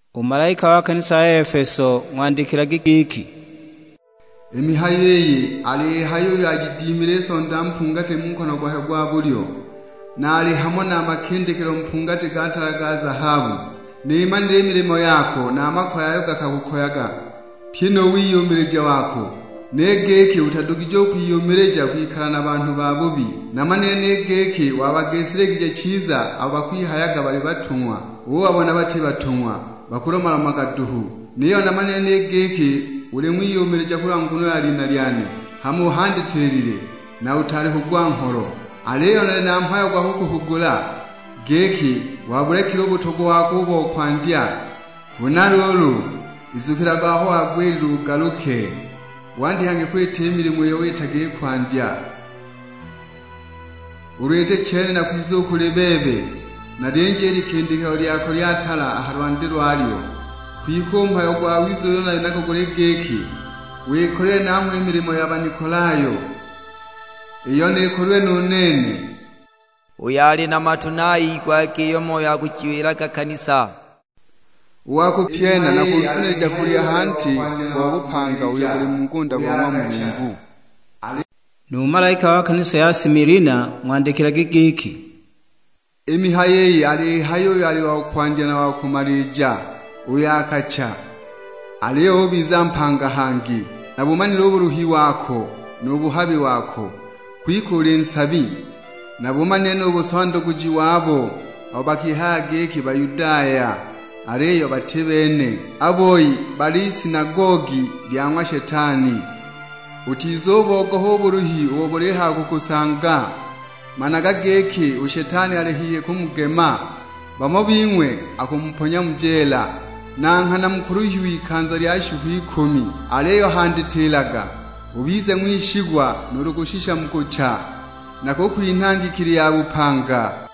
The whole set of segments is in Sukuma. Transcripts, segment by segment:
"U malaika wa kanisa ya Efeso ng'wandikilage giki, 'I mihayo iyi aliyihaya uyo ajidimile i Sonda mpungati mu nkono gwakwe gwa bulyo, na ali hamo na a makindikilo mpungati ga tala ga zahabu: Nimanile i milimo yako na a makoye ayo gakakukoyaga, pyi nu wiyumilija wako, ni giki utadugije u kwiyumilija kwikala na banhu babubi. Namanile ni giki wabagisiligije chiza abo bakwihayaga bali batung'wa, ubabona bati batung'wa, bakulomalomaga duhu. Niyo namanile ni giki uli ng'wiyumilija kulwa nguno ya lina lyane, hama uhandatilile, na utaali kugwa ngholo. Aliyo nali na mhayo gwa kukuhugula; giki, wabulekile u butogwa wako u bo kwandya. Huna luulu, izukilaga aho wagwilile ugaluke, wandye hangi kwita i milimo iyo witaga i kwandya. Ulu iti chene nakwiza u kuli bebe, nalyinje i likindikilo lyako lya tala a ha lwandi lwalyo. Kwike u mhayo gwawiza uyo uli nago guli giki, wikolilwe nangho i milimo ya Banikolayo, iyo nikolilwe nu nene. Uyo ali na matu ni ayigwage iyo Moyo alijiwila i kanisa. U wa kupyena nakunzunilija kulya a ha nti gwa bupanga uyo guli mu ngunda go ng'wa Mulungu.' "Nu malaika wa kanisa ya Similina ng'wandikilage giki, 'I mihayo iyi aliyihaya uyo ali wa Kwandya na wa Kumalija, uyo akacha, aliyo ubiza mpanga hangi: Nabumanile u buluhi wako nu buhabi wako, kwike uli nsabi. Nabumanile nu busondaguji wabo abo bakihayaga giki Bayudaya, aliyo bati bene; a boi bali isinagogi lya ng'wa Shetani. Utizubogoha u buluhi ubo bulihaya kukusanga, managa giki u Shetani ali hihi kumugema; bamo bing'we akumuponya mu jeela: na nghana mukuluhiwa ikanza lya shiku ikumi. Aliyo handatilaga, ubize ng'wishigwa nuulu kushisha mu kucha; nakukwinha ngikili ya bupanga.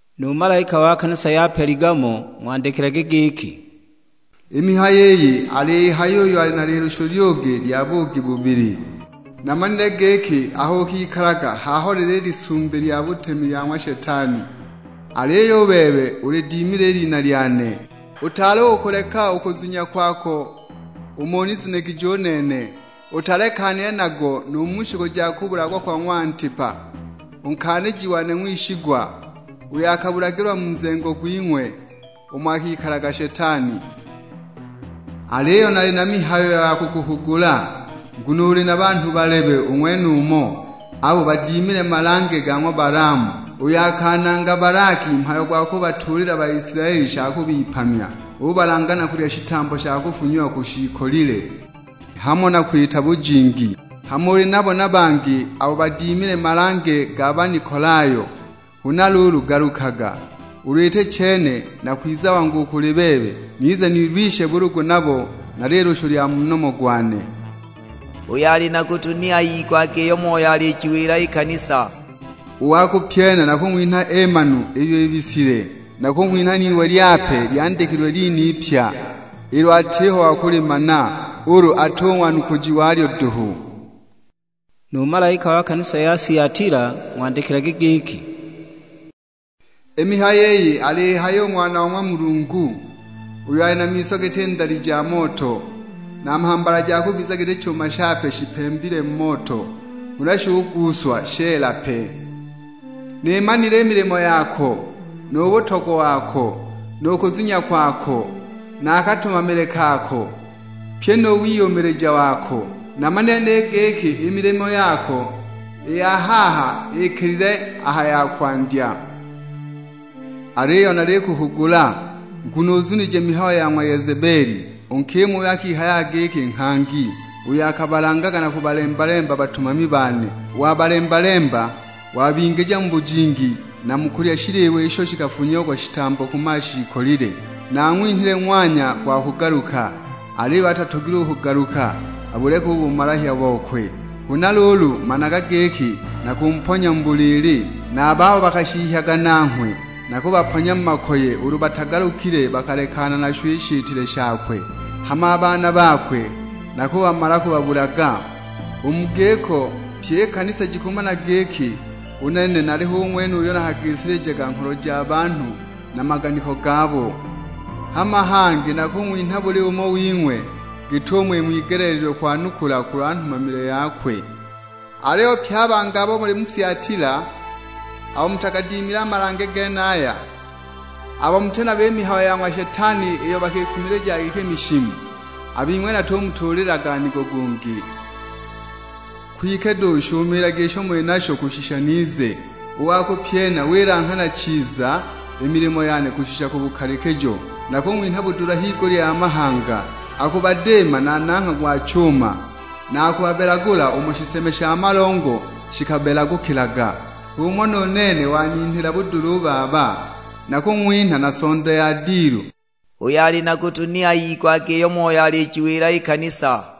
"Nu malaika wa kanisa ya Peligamo ng'wandikilage giki, 'I mihayo iyi aliyihaya uyo ali na lilushu lyugi lya buugi bubili: Namanile giki aho ukikalaga h'aho lili i lisumbi lya butemi lya ng'wa Shetani; aliyo u bebe ulidimile i lina lyane, utaali u kukuleka u kuzunya kwako umo unizunigije u nene, utalekanile nago nu mu shiku ja kubulagwa kwa ng'wa Antipa, u nkaaniji wane ng'wishigwa, uyo akabulagilwa mu nzengo gwing'we, umo akikalaga Shetani. Aliyo nali na mihayo ya kukuhugula; nguno uli na banhu balebe u ng'wenumo, abo badimile malange ga ng'wa Balaamu, uyo akananga Balaki mhayo gwa kubatuulila Baisilaeli sha kubipamya. Ubalanga na kulya shitambo sha kufunyiwa ku shiikolile, hamo na kwita bujingi. Hama uli nabo na bangi abo badimile malange ga Banikolayo. Huna luulu galukaga; ulu iti chene, nakwiza wangu u kuli bebe, nize nilwishe bulugu nabo na lilushu lya mu nomo gwane. Uyo ali na gutu ni ayigwage iyo Moyo alijiwila i kanisa. U wa kupyena nakung'winha eemanu iyo ibisilwe, nakung'winha n'iwe lyape lyandikilwe lina ipya, ilo atiho wa kulimana, ulu ati u ng'wanukuji walyo duhu.' "Nu malaika wa kanisa ya Siatila ng'wandikilage giki, 'I mihayo iyi aliyihaya u Ng'wana wa ng'wa Mulungu, uyo ali na miso giti ndali ja moto, na mhambala ja kubiza giti chuma shipembilwe mu moto huna shuguuswa sheela pe: Nimanile i milimo yako, nu butogwa wako, nu kuzunya kwako, na a katumamile kako, pyi nu wiyumilija wako. Namanile ni giki i milimo yako i ya haha ikilile a ha ya kwandya. Aliyo nalikuhugula, nguno uzunije mihayo ya ng'wa Yezebeli, u nkima uyo akihayaga giki nghangi; uyo akabalangaga na kubahembeka batumami bane, wabalemba-lemba, wabingija mu bujingi na mu kulya shiliwa isho shikafunyiagwa shitambo ku mashiikolile. Naang'winhile ng'wanya gwa kugaluka, aliyo atatogilwe u kugaluka abuleke u bumalahya bokwe. Huna luulu managa giki nakumponya mu buliili; na a babo bakashihyaga nanghwe nakubaponya mu makoye ulu batagalukile bakalekana nasho i shitile shakwe. Hama a baana bakwe nakubamala kubabulaga! U mu giko pyi i kanisa jikumana giki u nene hu nali ng'wene uyo nakagisilijaga ngholo ja banhu na maganiko gabo. Hama hangi nakung'winha buli umo wing'we git'umo ing'wigeleelilwe kwanukula kulwa nhumamile yakwe. " 'Aliyo pye a bangi abo muli mu Siatila, abo mutagadimile a malange genaya, abo muti nayo i mihayo ya ng'wa Shetani iyo bakikumilijaga giki mishimu; a bing'we natumutuulilaga nigo gungi. Kwike duhu shumiilagi isho muli nasho kushisha nize. U wa kupyena, wilanghana chiza i milimo yane kushisha ku bukalikijo, nakung'winha budula higulya ya mahanga. Akubadiima na nangha gwa chuma, na akubabelagula umo shiseme sha malongo shikabelagukilaga. H'umo nu nene waninhila budula u Baba. Nakung'winha na sonda ya dilu. Uyo ali na gutu ni ayigwage iyo Moyo alijiwila i kanisa.'